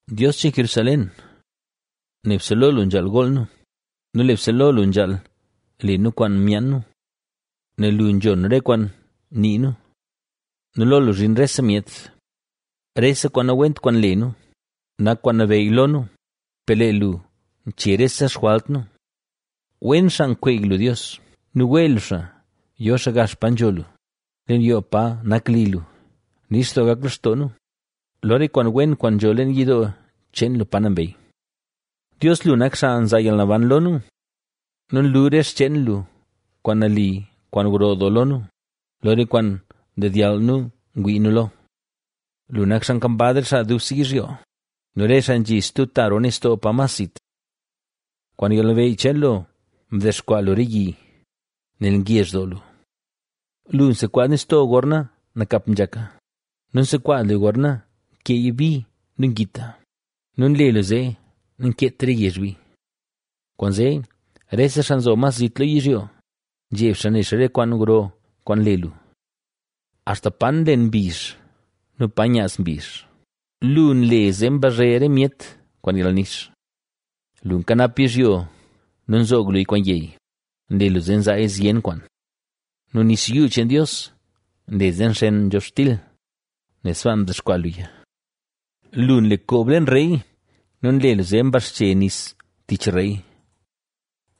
Dios cheen Jerusalén, nebse lo lu nzhaal gool nu nu nebse lo lu nzhaal le nu kwaan myaan nu. Nel lu nzhon re kwaan nii nu nu lo lu zhin rese myet. Rese kwaan nawent kwaan nle nu, nak kwaan nabeyy lo nu, per lee lu nche rese xjwalt nu. Wen xaa nkweey lu Dios nu wee lu xaa yo xaa gax pa nzho lu, leen yoo pa nak li lu, nix doo gak lextoo nu, lo re kwaan wen kwaan nzho leen yidoo cheen lu pa nambey. Dios, lu nak xaa nzaa yalnaban lo nu nu nlu re xcheen lu kwaan nali kwaan gro doo lo nu, lo re kwaan ndedyall nu ngwii nu lo. Lu nak xaa kambaz re xaa dubse yizhyo nu re xaa nzhi stub ta roo nistoo pa mas zit. Kwaan yalnabeyy cheen lu mdexkwaa lu re yi, nel ngezh doo lu. Lu nsekwaaz nistoo gorna nakap nzhaka nu nsekwaaz luya gorna nkeeya bi nu ngita nu nle lu zee nankeet re yezh bi. Kwaanzee rese xaa nzo mas zit lo yizhyo, nzheb xaa ne xaa re kwaan gro kwaan nle lu. Axta pa nlen mbizh nu pa nyaaz mbizh, lu nle zee mbazhe re myet kwaan yalnix. Lu nkanap yizhyo nu nzoog luya kwaan yey, nle lu zee nzaaya zyen kwaan. Nu nis yuu cheen Dios nle zee nxen nzhobxtil, nel sbaa mdexkwaa luya. Lu nle koob leen rey nu nle lu zee mbaxche nis tich rey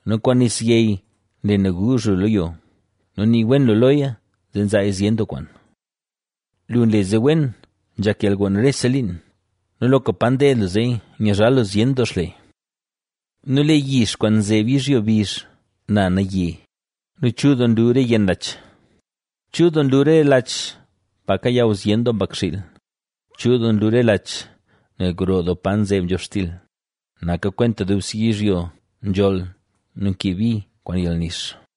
nu kwaan nis yey nle naguuzh lu lo yo nu nii wen lu loya nu nzaaya zyen doo kwaan. Lu nle zee wen nzhak yalgon rese liin, nu loka pa ded lu zee yizhal lu zyen doo xle, Nu lee yix kwaan nzeb yizhyo bizh na naye nu chul doo nlu re yenn lach, Chul doo nlu re lach pa kayaw zyen doo mbakxiil, chul doo nlu re lach, nel gro doo pa nzeb nzhobxtil; naka kwenta dubse yizhyo nzholl nu nkee bi kwaan yalnix.